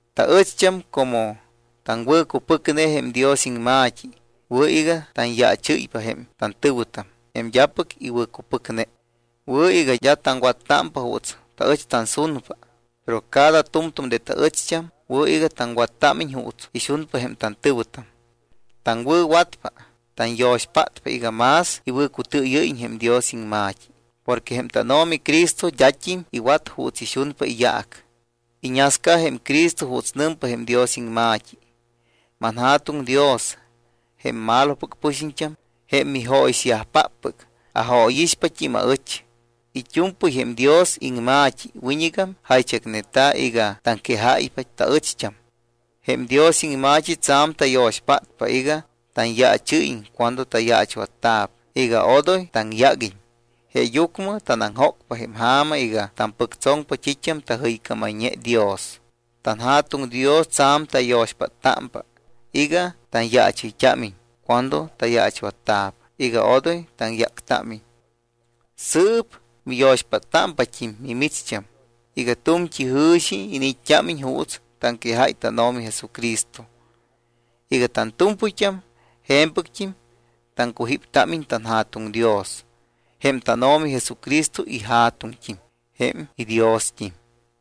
Taɨcht́am como taŋwɨ̱cupɨcne jém Dios iŋma̱t́i, wɨ̱ iga tanyaachɨ́ypa jém tantɨ̱wɨtam, jém d́apɨc iwɨ̱cupɨcne. Wɨ̱ iga d́a taŋwattámpa juuts taɨch tansunpa. Pero cada tu̱mtu̱m de taɨcht́am wɨ̱ iga taŋwattámiñ juuts ixunpa jém tantɨ̱wɨtam. Taŋwɨ̱watpa, tanyo̱xpátpa iga más iwɨ̱cutɨɨyɨ́yiñ jém Dios iŋma̱t́i. Porque jém tánO̱mi Cristo d́at́im iwat juuts ixunpa iyaac. Iñasca jém Cristo juuts nɨmpa jém Dios iŋma̱t́i: “ManJa̱tuŋ Dios, jém malopɨc pɨxiñt́am, jém mijóyixyajpáppɨc, ajóyixpat́im aɨch.” It́u̱mpɨy jém Dios iŋma̱t́i wiñɨgam jaychacneta̱ iga taŋquejáypa taɨcht́am. Jém Dios iŋma̱t́i tsa̱m tayo̱xpátpa iga tanyaachɨ́yiñ cuando tayaachwatta̱p iga odoy taŋyáguiñ. Jeeyucmɨ tanaŋjócpa jém ja̱ma iga tampɨctsoŋpa t́it́am tajɨycámayñe Dios. TanJa̱tuŋ Dios tsa̱m tayo̱xpáttámpa iga tanyaachɨyt́ámiñ cuando tayaachwatta̱p, iga odoy taŋyáctámiñ. Sɨɨp miyo̱xpáttámpat́im mimicht́am iga tu̱mt́i jɨ̱xi iniit́t́ámiñ juuts taŋquejáy tánO̱mi Jesucristo iga tantu̱mpɨyt́am je̱mpɨct́im taŋcujíptámiñ tanJa̱tuŋ Dios, jém tánO̱mi Jesucristo iJa̱tuŋt́im, jém iDiost́im.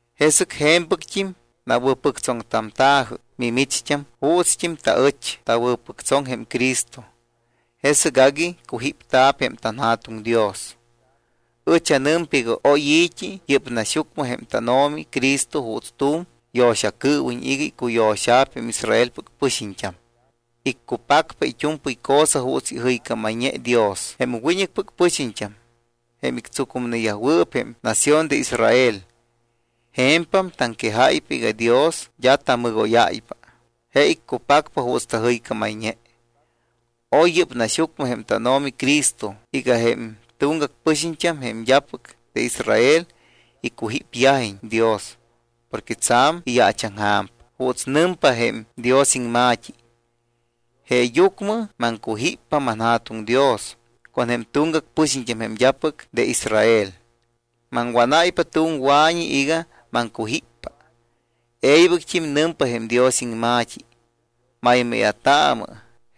Jesɨc je̱mpɨct́im nawɨ̱pɨctsoŋtamta̱jɨ mimicht́am juutst́im taɨch tawɨ̱pɨctsoŋ jém Cristo, jesɨc agui cujípta̱p jém tanJa̱tuŋ Dios. Ɨch anɨmpa iga oy i̱t́i yɨ́p naxyucmɨ jém tánO̱mi Cristo juuts tu̱m yo̱xacɨɨwiñ iga icuyo̱xa̱p jém Israelpɨc pɨxiñt́am. Iccupacpa it́u̱mpɨy cosa juuts ijɨycámayñe Dios jém wiñɨcpɨc pɨxiñt́am, jém ictsucumnewɨɨp jém nación de Israel. Je̱mpam taŋquejáypa iga Dios d́a tamɨgóyáypa. Je iccupacpa juuts tajɨycámayñe. Oy yɨ́p naxyucmɨ jém tánO̱mi Cristo iga jém tuŋgac pɨxiñt́am, jém d́apɨc de Israel, icujípyajiñ Dios porque tsa̱m iyaachaŋja̱mpa. Juuts nɨmpa jém Dios iŋma̱t́i: Jeeyucmɨ maŋcujíppa, manJa̱tuŋ Dios, con jém tuŋgac pɨxiñt́am, jém d́apɨc de Israel. Maŋwánáypa tu̱m wa̱ñi iga maŋcujíppa. E̱ybɨct́im nɨmpa jém Dios iŋma̱t́i: Maymáya̱taamɨ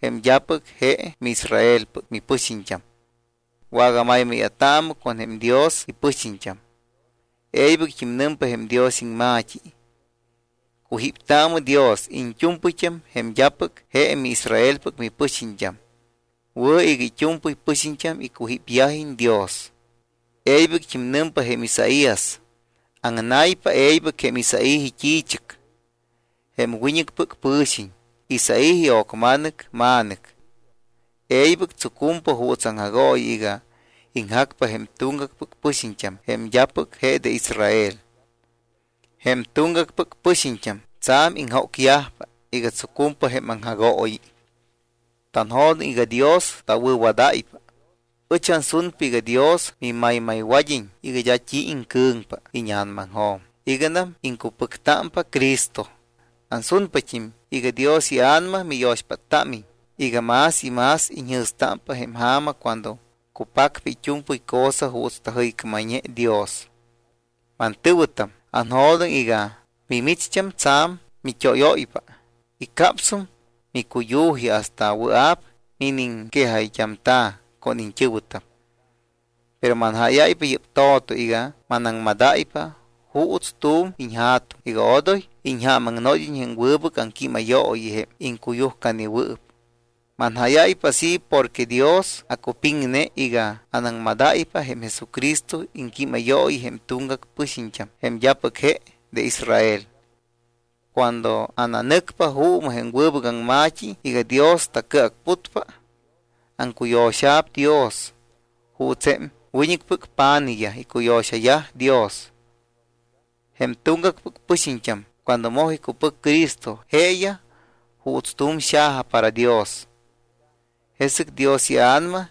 jém d́apɨc je miIsraelpɨc mipɨxiñt́am. Wagamaymáya̱taamɨ con jém Dios ipɨxiñt́am. E̱ybɨct́im nɨmpa jém Dios iŋma̱t́i: Cujíptaamɨ Dios iñt́u̱mpɨyt́am, jém d́apɨc je miIsraelpɨc mipɨxiñt́am. Wɨ̱ iga it́u̱mpɨy pɨxiñt́am icujípyajiñ Dios. E̱ybɨct́im nɨmpa jém Isaías: Aŋnaypa e̱ybɨc jém Isaí it́i̱chɨc. Jém wiñɨcpɨc pɨ̱xiñ Isaí io̱cma̱nɨc ma̱nɨc e̱ybɨc tsucumpa juuts aŋjagooyi iga iŋjacpa jém tuŋgacpɨc pɨxiñt́am jém d́apɨc je de Israel. Jém tuŋgacpɨc pɨxiñt́am tsa̱m iŋjócyajpa iga tsucumpa jém aŋjagooyi. Tanjo̱doŋ iga Dios tawɨ̱wadáypa. Ɨch ansunpa iga Dios mimaymaywad́iñ iga d́a t́i iŋcɨ̱ŋpa íña̱namaŋjo̱m iganam iŋcupɨctámpa Cristo. Ansunpat́im iga Dios iA̱nama miyo̱xpáttámiñ iga más y más iñjɨ̱stámpa jém ja̱ma cuando cupacpa it́u̱mpɨy cosa juuts tajɨycámayñe Dios. Mantɨ̱wɨtam, aŋwɨ̱jo̱doŋ iga mimicht́am tsa̱m mit́óyóypa y capsum micuyu̱ji hasta wɨa̱p miniŋquejayt́amta̱ con iñt́ɨ̱wɨtam. Pero manjáyáy yɨ́p to̱to iga manaŋmadáypa juuts tu̱m iñja̱tuŋ iga odoy iñjaamaŋnod́iñ jém wɨbɨc aŋquímayooyi jém iŋcuyujcanewɨɨp. Manjáyáypa así porque Dios acupiŋne iga anaŋmadáypa jém Jesucristo iŋquímayooyi jém tuŋgac pɨxiñt́am jém d́apɨc je de Israel. Cuando ananɨcpa juumɨ jém wɨbɨc aŋma̱t́i iga Dios tacɨacputpa, aŋcuyo̱xa̱p Dios juuts jém wiñɨcpɨc pa̱nijyaj icuyo̱xayaj Dios. Jém tuŋgacpɨc pɨxiñt́am cuando moj icupɨc Cristo, jeeyaj juuts tu̱m xaja para Dios. Jesɨc Dios iA̱nama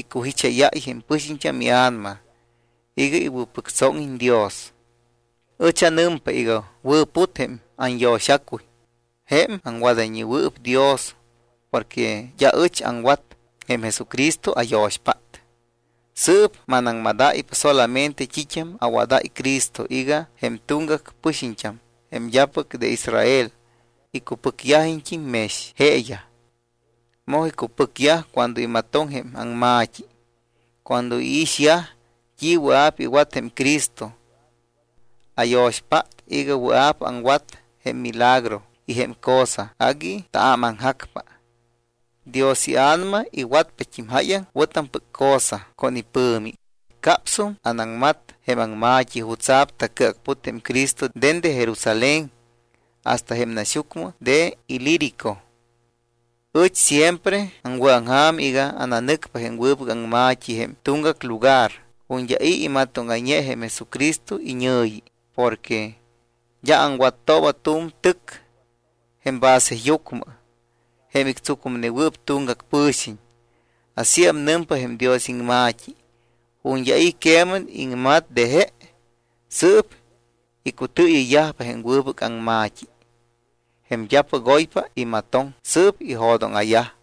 icujicháyáy jém pɨxiñt́am ia̱nama iga iwɨ̱pɨctsóŋiñ Dios. Ɨch anɨmpa iga wɨ̱put jém anyo̱xacuy jém aŋwadayñewɨɨp Dios porque d́a ɨch aŋwat, jém Jesucristo ayo̱xpát. Sɨɨp manaŋmadáypa solamente t́it́am awadáy Cristo iga jém tuŋgac pɨxiñt́am, jém d́apɨc de Israel, icupɨcyajiñt́im mex jeeyaj. Moj icupɨcyaj cuando imatoŋ jém aŋma̱t́i, cuando iixyaj t́i wɨa̱p iwat jém Cristo. Ayo̱xpát iga wɨa̱p aŋwat jém milagro y jém cosa agui taámaŋjacpa. Dios iA̱nama iwatpat́im jáyaŋ wɨ̱tampɨc cosa con ipɨ̱mi. Capsum anaŋmat jém aŋma̱t́i jutsa̱p tacɨacput jém Cristo dende Jerusalén hasta jém naxyucmɨ de Ilírico. Ɨch siempre aŋwɨ̱aŋja̱m iga ananɨcpa jém wɨbɨc aŋma̱t́i jém tuŋgac lugar ju̱t́ d́a i̱ imatóŋayñe jém Jesucristo iñɨ̱yi. Porque d́a aŋwattooba tu̱m tɨc jém baseyucmɨ jém ictsucumnewɨɨp tuŋgac pɨ̱xiñ. Asíam nɨmpa jém Dios iŋma̱t́i: Ju̱t́ d́a i̱ queman iŋmat de je, sɨɨp icutɨɨyɨyyajpa jém wɨbɨc aŋma̱t́i. Jém d́apɨc oypa imatoŋ, sɨɨp ijo̱dóŋa̱yaj.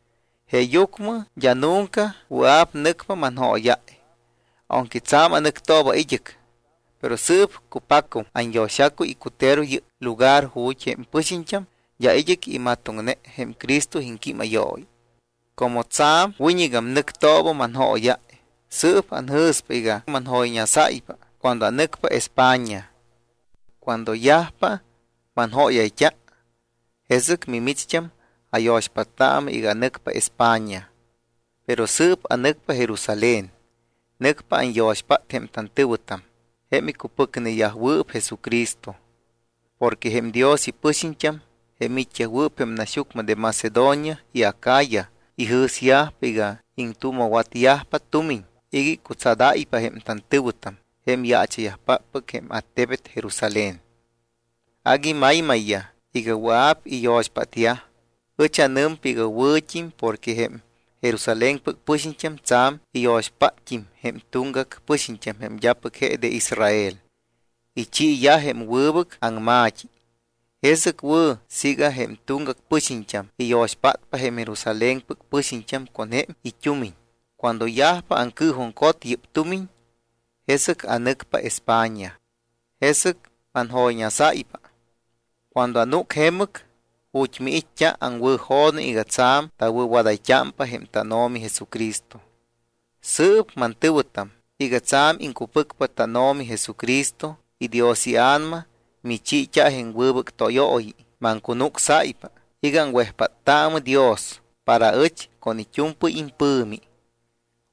Jeeyucmɨ d́a nunca wɨa̱p nɨcpa manjóyáy aunque tsa̱m anɨctooba id́ɨc. Pero sɨɨp cupacum anyo̱xacuy icutero yɨ́p lugar ju̱t́ jém pɨxiñt́am d́a id́ɨc imatoŋne jém Cristo iŋquímayooyi. Como tsa̱m wiñɨgam nɨctooba manjóyáy, sɨɨp anjɨ̱spa iga manjoyñasáypa cuando anɨcpa España. Cuando yajpa manjóyayt́a, jesɨc mimicht́am ayo̱xpáttaamɨ iga anɨcpa España. Pero sɨɨp anɨcpa Jerusalén. Nɨcpa anyo̱xpát jém tantɨ̱wɨtam, jém icupɨcneyajwɨɨp Jesucristo. Porque jém Dios ipɨxiñt́am jém it́yajwɨɨp jém naxyucmɨ de Macedonia y Acaya ijɨ̱syajpa iga iŋtuuma̱watyajpa tumiñ iga icutsadáypa jém tantɨ̱wɨtam, jém yaacha̱yajpáppɨc jém attebet Jerusalén. Agui maymayyaj iga wɨa̱p iyo̱xpátyaj. Ɨch anɨmpa iga wɨ̱t́im porque jém Jerusalénpɨc pɨxiñt́am tsa̱m iyo̱xpátt́im jém tuŋgac pɨxiñt́am jém d́apɨc je de Israel. Ichiiyaj jém wɨbɨc aŋma̱t́i. Jesɨc wɨ̱ siiga jém tuŋgac pɨxiñt́am iyo̱xpátpa jém Jerusalénpɨc pɨxiñt́am con jém it́umiñ. Cuando yajpa aŋcɨɨjuŋcot yɨ́p tumiñ, jesɨc anɨcpa España. Jesɨc manjoyñasáypa. Cuando anúc jemɨc ju̱t́ miit́t́a, aŋwɨ̱jo̱doŋ iga tsa̱m tawɨ̱wadayt́ámpa jém tánO̱mi Jesucristo. Sɨɨp mantɨ̱wɨtam, iga tsa̱m iŋcupɨcpa tánO̱mi Jesucristo y Dios iA̱nama michiit́a jém wɨbɨc tóyooyi, maŋcunucsáypa iga aŋwejpádayt́aamɨ Dios para aɨch con it́u̱mpɨy impɨ̱mi.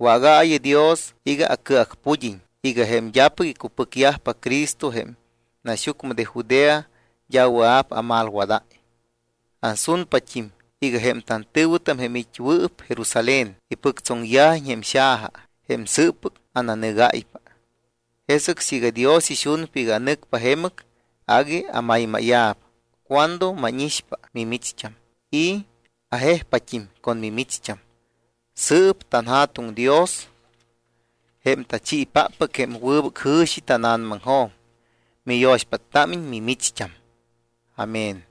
Wágaayɨ Dios iga acɨacpud́iñ iga jém d́apɨc icupɨcyajpa Cristo jém naxyucmɨ de Judea d́a wɨa̱p amalwadáy. Ansunpat́im iga jém tantɨ̱wɨtam, jém it́wɨɨp Jerusalén, ipɨctsoŋyajiñ jém xaja jém sɨɨppɨc ananɨgáypa. Jesɨc siiga Dios ixunpa iga anɨcpa jemɨc, agui amaymáya̱p cuando mánixpa mimicht́am y ajejpat́im con mimicht́am. Sɨɨp tanJa̱tuŋ Dios, jém tachiipáppɨc jém wɨbɨc jɨ̱xi tána̱namaŋjo̱m, miyo̱xpáttámiñ mimicht́am. Amén.